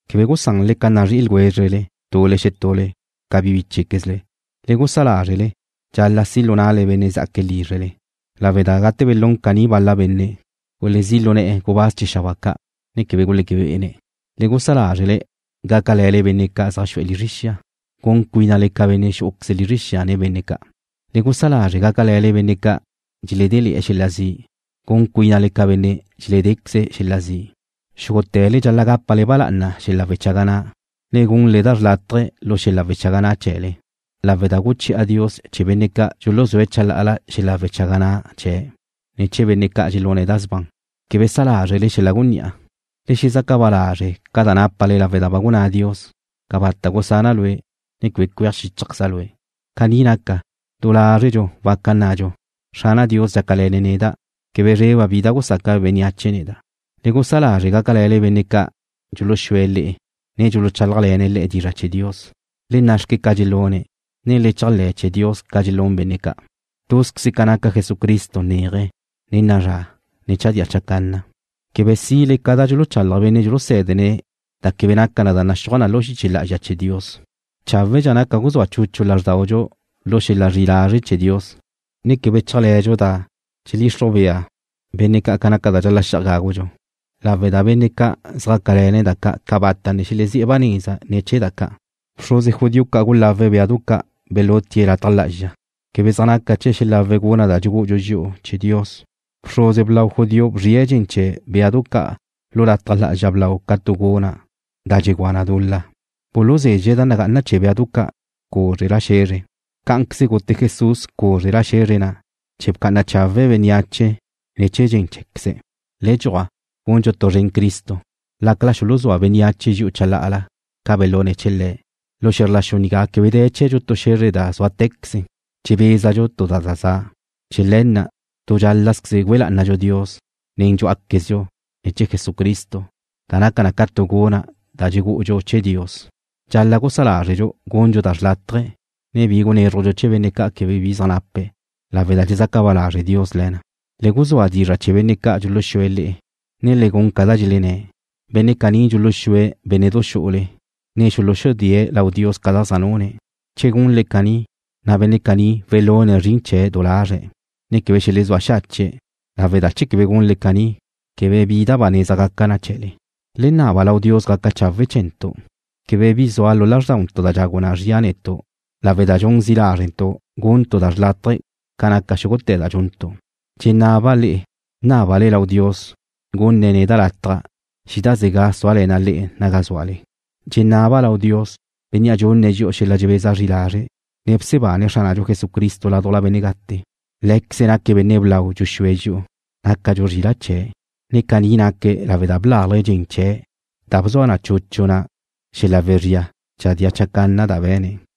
Quebe gusanle ca nazrí'i ljwézrele tule xetule ca bíchequezle. Le gusá lázrele dxal-la' si' lu na'le benne' zá'aque̱' lízrele, lawe' da gate belún caní bal-la benne', gulezí' lu ne̱'e̱ gubáz chee̱ xabáa ca', ne quebe guleque be'ene̱'. Le gusá lázrele gácale̱le benne' zaj xu'e̱ lizre xia, gun cuínale ca benne' xú'uqueze lizre xia nen benne' ca'. Le gusá lázrele gácale̱le benne' ca' dxeledée̱' xel-la' zi', gun cuínale ca benne' dxeledéqueze̱' xel-la' zi'. Xúgute̱le dxal-la' gápale ba lá'ana xel-la' wechaga na', ne gunle da xlátaje̱ lu xel-la' wechaga na' chee̱le, lawe' da guchi'a Dios chee̱ benne' ca' dxuluzúe̱' chalá'ala xel-la' wechaga na' chee̱', ne chee̱ benne' ca' dxelune̱' da sban. Quebe sa lázrele xel-la' gunní'a. Le xezaca ba lázrele ca da nápale lawe' da ba gunná Dios: “Cabata' gusana' lue', ne quebe cueaj xíchajqueza' lue'.” Caní naca, du lázredxu waca nnadxu: Xrana' Dios dxácale̱ne̱' neda'. Quebe zreba' bi da gusaca bénneache neda'. Le gusá lázrele gácale̱le benne' ca' dxuluxúe̱' le'e, ne dxuluchálajle̱ne̱' le'e dizra' chee̱ Dios. Le na' xque ca da dxelúne̱', ne le chéajle̱ chee̱ Dios ca dxelún benne' ca'. Túzqueze ca naca Jesucristo neaje, ne na'a zra, ne chadía chacanna. Quebe sile ca da dxuluchalaj benne' dxulusé̱dene̱' da quebe naca na ca da naxúaj na lu xiche lá'azxa chee̱ Dios. Cháwedxa naca guzúa chuchu lázrdaudxu lu xel-la' zri'i lazre' chee̱ Dios, ne quebe chéajle̱dxu da dxeledxixruj bea benne' ca naca da dxal-la' xi'aj gágudxu, lawe' da benne' ca' zjácale̱ne̱' da ca' cabata' ne xelezí' ba neza ne̱ chee̱ da ca'. Bxruze judío ca' gulawe̱' béadu ca' belutie̱' lataj lá'azxa. Quebe zaj naca chee̱' xelawe̱' guna' da dxugú'udxu dxi'u chee̱ Dios. Bxruze blau judío bzrie̱' dxen chee̱ béadu ca' lu lataj lá'azxa blau ca tu guna' da dxegúa na dul-la. Buluzezxe̱' da nagá'ana chee̱ béadu ca' cúzrela xe̱zre. Cá'anqueze gute Jesús cúzrela xe̱zre na' chee̱ bca'ana chawe̱' bénneache ne̱ chee̱ dxen cheé̱queze̱'. Le dxuaj, gundxu tu zren Cristo, lácala xuluzúa bénneache dxi'u chalá'ala ca belune̱' chee̱ Le̱'. Lu xe̱zr la xu nigá quebe de̱ chee̱dxu tu xe̱zre da súate̱queze. Dxebézadxu tu da za za'. Chee̱ le̱ na' tu dxál-lazqueze güe lá'anadxu Dios nen dxú'aquezdxu ne̱ chee̱ Jesucristo, da naca na ca tu guna' da dxugú'udxu chee̱ Dios. Dxal-la' gusá lázredxu gundxu da xrlátaje, ne bi gunézrujdxu chee̱ benne' ca' quebe bi zaj nape̱', lawe' da dxezaca ba lazre' Dios le̱ na. Le guzúa dizra' chee̱ benne' ca' dxuluxúe̱' le'e, ne le gun ca da dxelenné̱'. Benne' caní dxuluxúe̱' bénne'du xu'ule, ne xuluxudée̱' lau Dios ca da zaj nune̱'. Che gunle caní, na' benne' caní welune̱' zrin chee̱' du lazre̱', ne quebe xelezúa xache̱', lawe' da che quebe gunle caní, quebe bi da ba neza gaca na chee̱le. Le naba lau Dios gaca chawe' chee̱ntu'. Quebe bi zua lu lázrdauntu' da dxagu na zria netu' lawe' da dxun zi' lázrentu' guntu' da xrlátaje ca naca xúgute̱ da dxuntu'. Dxenaba' le'e nábale lau Dios gunne̱' neda' lataj xídazega' súale̱na' le'e naga zúale. Dxenaba' lau Dios, Bénnea' dxunne̱' dxi'u xel-la' dxebeza zri lazre', ne bsebane̱' Xránadxu Jesucristo ládujla benne' gate. Lé̱queze̱' naque̱' Benne' Blau Dxuxúe̱' Dxi'u, nácadxu zrila' chee̱', na' caní naque̱' lawe' da blalje̱' dxen chee̱' da bzua chuchu na xel-la' wezría chadía chacanna da be̱ne̱'.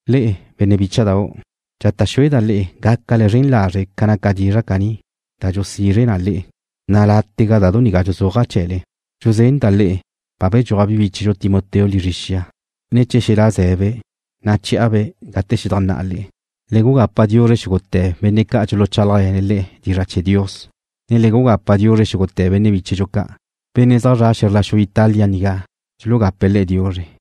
Le'e, benne' bícha'dau', dxata' xueda' le'e gácale zren lazre' ca naca dizra' caní, da dxulusizre na le'e, na' látega da du nigá dxuzúaja' chee̱le. Dxuzenda' le'e ba bedxúaj bi bíchedxu Timoteo lizre xia, ne che xelá' zé̱'e̱be', na' che̱'a-be' gate xedajnná'a le'e. Le gugapa diuzre xúgute̱ benne' ca' dxuluchálajle̱ne̱' le'e dizra' chee̱ Dios, ne le gugapa diuzre xúgute̱ benne' bíchedxu ca'. Benne' zaj zre̱'e̱ xe̱zr la xu Italia nigá dxulugape̱' le'e diuzre.